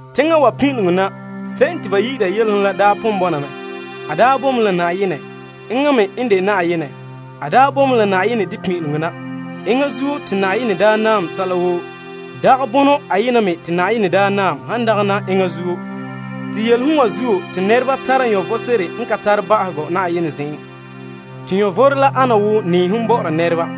Teŋa wa pin'ileŋɔ na, se'em te ba yi'ira Yelehom la pon bɔna mɛ. A boe mɛ la Yenɛ. Enŋa me n de Yenɛ. A daa boe mɛ la Yenɛ de pin'ileŋɔ na. Enŋa zuo te a daa naam sɛla woo. Dagɛ la bonɔ ayena te a naam, han dagana la enŋa zuo. Te Yelehom wa zuo te nɛreba tara vom sebo n ka tare ba'ahegɔ a zen'en. Te vom la ana wo nɛɛhom bɔ'ɔra nɛreba.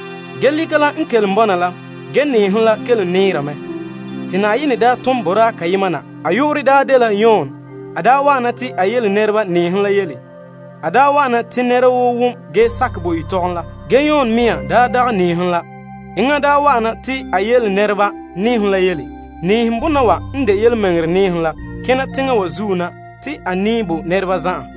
Lika la n kelom bɔna la, ge nɛɛhom la kelom nɛɛre mɛ. Te Yenɛ daa tom boraa kayema na. A yu'urɛ daa dela Yon. A wa'ana te a yele la nɛreba nɛɛhom la yele. A wa'ana te nɛra woo wom ge sakɛ yetɔgɔm la. Ge Yon mea dagɛ nɛɛhom la. Enŋa wa'an me na te a yele nɛreba nɛɛhom la yele. Nɛɛhom bono wa n de yelemɛŋɛrɛ nɛɛhom la kena teŋa wa zuo na te a nɛɛ bo nɛreba zan'an.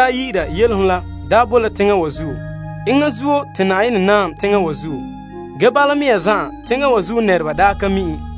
Yelehom la boe la teŋa wa zuo. Enŋa zuo, te a naam teŋa wa. Ge bala mea zan'an, teŋa wa zuo nɛreba daa ka mi' en.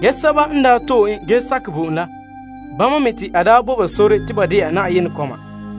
Ge sɛba n to'e en ge sakɛ bo en la, bama te a bo ba sore te nɛreba de'a Yenɛ kɔma.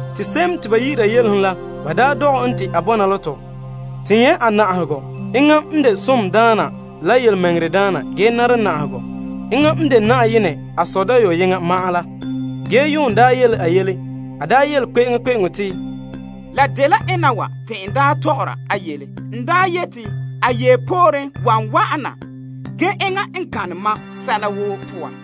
Te se'em te ba yi'ira Yelehom la, ba dɔgɛ en te a bɔna la tɔ. To nyɛ' a na'ahegɔ. Enŋa n de somdaana la yelemɛŋɛrɛdaana ge nara na'ahegɔ. Enŋa n de a Sɔ dayɔyeŋa. Yon daa yele a yele. A yele kpe'eŋkpe'eŋo te, La dela ena wa te n daa tɔgɔra a yele. N yeti a yee pooren wan wa'ana, ge enŋa n gana mam sɛla woo poan.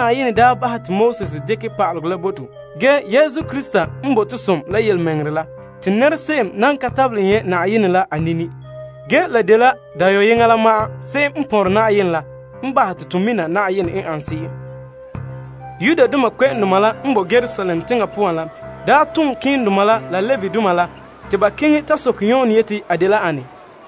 Yenɛ n daa bahɛ te Moses dekɛ pa'alegɔ la bo to. Ge, Yesu Krista n bo to som la yelemɛŋɛrɛ la. Te nɛrese'em nan ka tabelɛ nyɛ' Yenɛ la a nini. Ge, la dela dayɔyeŋa la, se'em n pɔnrɛ a Sɔ la n bahɛ te to mina Yenɛ n ane se'em. Yudoma la n boe Yerusalem teŋa poan la daa tom malemadoma la Levidoma la te ba keŋɛ ta soke Yon te a dela ane?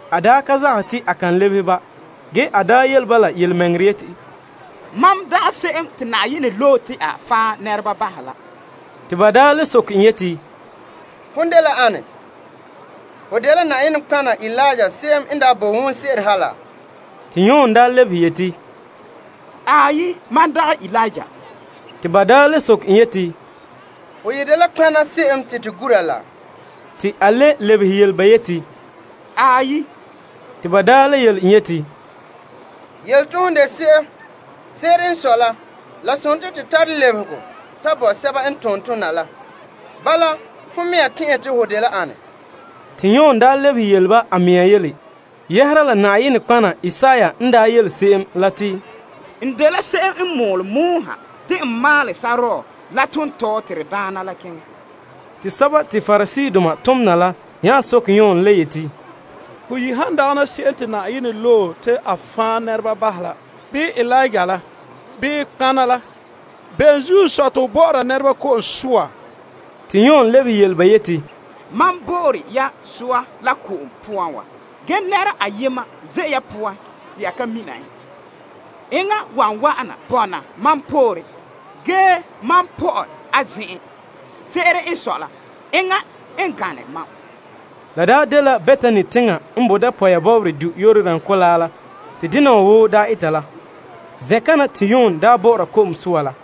A daa ka zagahɛ te a kan lebehe ba. Ge, a yele ba yelemɛŋɛrɛ yeti, Mam dagɛ se'em te Na'ayenɛ loe la. Te ba daa le soke en yeti, Ho dela ane? Ho dela Eliya se'em n daa bo wonse'eren ha laa? Te Yon lebehe yeti, Aai, mam dagɛ Eliya. Te ba le soke en yeti, Ho yi dela nɔtɔgɔha se'em te to gura laa? Te a le lebehe yele ba yeti, Aai. Te daa yele en yeti, Yele to hon yi de se'em. Se'ere n sɔe la, la sontii to tara lebehegɔ ta bo sɛba n tom tɔna la. Bala, hon mea tɛn'ɛhe te ho dela ane? Te Yon lebehe yele ba a mea yele yɛhera la nɔtɔgɔha Isaiah n daa yele se'em la te, N dela se'em n mɔɔle yeti, Maalɛ sore pɔgɔtia la poan te de gan'an tontɔɔ bo to Na'ayenɛ la. Te sɛba te Pariseedoma tom na la nya soke Yon le yeti, Ho yi han dagana se'em te Yenɛ loe la, bii Eliya la, bii nɔtɔgɔha la, bene zuo n sɔe te ho bɔ'ɔra nɛreba ko'om soa? Te Yon lebehe yele ba yeti, Mam bo'ore ya soa la ko'om poan wa. Ge nɛra ayema ze' ya poan te ya ka mina en. Enŋa wan wa'an mam pooren na, ge mam pɔ'ɛ n pirege a tagara. Se'ere n sɔe la, a gane mam. La dela Betani teŋa la n boe dapɔya bɔbɔrɛ du' Yordan Kolaa la te dena wa woo daa eta la. Zen'kana te Yon bɔ'ɔra ko'om soa la.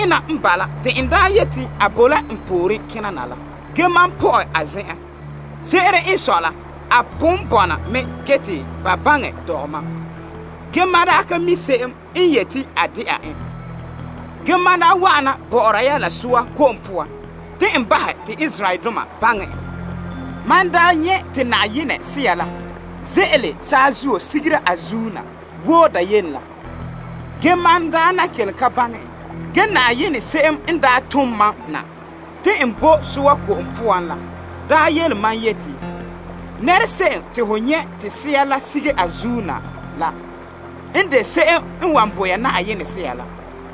Nɛre'ena n bala te n yeti a bo la n pooren kena na la. Ge, mam pɔ'ɛ a zen'en. Se'ere n sɔe la, a pon bɔna mɛ ge te ba baŋɛ dɔgɛ mam. Ge mam ka mi' se'em n yeti a de'a en. Ge, mam wa'ana bɔ'ɔra ya la ko'om soa te n bahɛ te Israeldoma baŋɛ en. Mam daa nyɛ' te Na'ayenɛ Sea la ze'ele saazuo sigera a zuin na wo dayene la. Ge mam kelom ka baŋɛ en. Ge se'em n daa tom mam na te n bo ko'om soa la daa yele mam yeti, Nɛrese'em te ho nyɛ' te Sea la sige a zuin na la n de se'em n wan bo ya Yenɛ Sea la.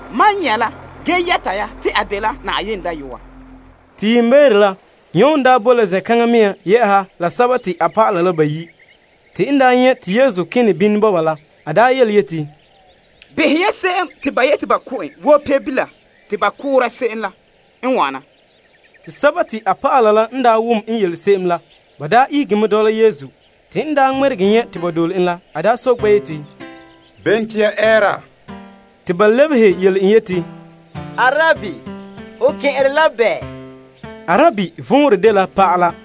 Mam nyɛ' mɛ, ge yɛta ya te a dela Yenɛ Dayɔa. Te yiimbeere la Yon daa boe la zen'kaŋa mea la a dɔlɔba la bayi', te n nyɛ' te Yesu kene bini bɔba la, a yeti, Behɛ ya, Yenɛ Pebila la n wana. Te a dɔlɔba la bayi' la n wom n yele se'em la, ba ihege mɛ dɔla Yesu. Te n ŋmɛregɛ nyɛ' te ba dole en la, a soke ba yeti, Bene te ya ɛɛra? Te ba lebehe yele en yeti, Naa, Arabi, ho kɛn'ɛre la bɛɛ? Arabi vɔnrɛ dela pa'ala.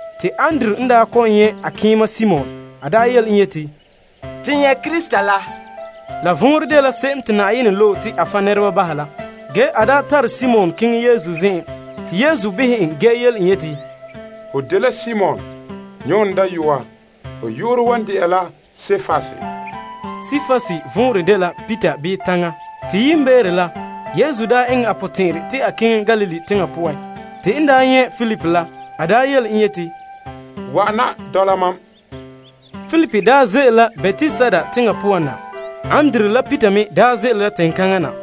Te Andrew n kɔ'ɔn nyɛ' a keema Simon la yele en yeti, To nyɛ' Krista, se'em te Na'ayenɛ loe la. Ge a tare Simon keŋɛ Yesu zen'en. Te Yesu behɛ en ge yele en yeti, Ho dela Simon, Yon dayɔa. Ho yu'urɛ wan de'a la Kepas. Kepas vɔnrɛ dela Peter. Te yiimbeere la, Yesu eŋɛ a potɛn'ɛrɛ te a keŋɛ Galilee teŋa poan. Te n nyɛ' Filip la, a yele en yeti, Wa'ana, dɔla mam. Filip ze'ele la Betsaida teŋa poan na. Andrew la Peter me ze'ele la teŋkaŋa na.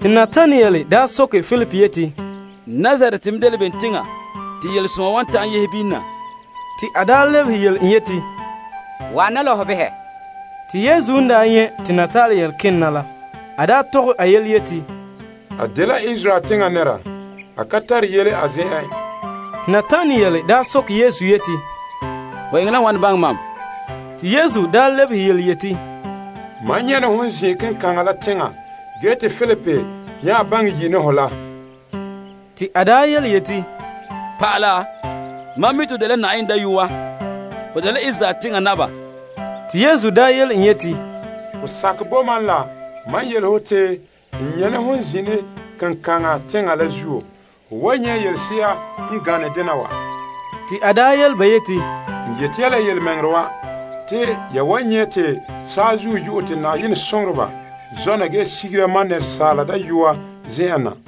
Te Natanael soke Filip yeti, Nazaret me dela bem teŋa te yelesoma wa ta'an yehe bini na? Te a lebehe yele en yeti, Wa'ana la ho behɛ. Te Yesu n nyɛ' te Natanael kene na la, a tɔgɛ a yele te, A dela Israel teŋa nɛra. A ka tare yele a zen'en. Te Natanael soke Yesu yeti, Ho eŋɛ la wane baŋɛ mam? Te Yesu daa lebehe yeti, Mam nyɛ' ne hon zine kenkaŋa la teŋa te Filip yi' ne ho la. Te a yeti, Naa, mam mi' te ho dela Na'ayenɛ Dayɔa. Ho dela Israel teŋa naba. Te Yesu yele en yeti, Ho sakɛ bo mam la mam yele ho te n nyɛ' ne hon zine kenkaŋa teŋa la zuo? Ho wan nyɛ' yelese'a n gane dena wa. Te a yele ba yeti, N yeti ya la yelemɛŋɛrɛ wa. Te ya wan nyɛ' te saazuo yo'ɛ te Na'ayenɛ soŋoreba zɔna ge sigera Asaala Dayɔa zen'en na.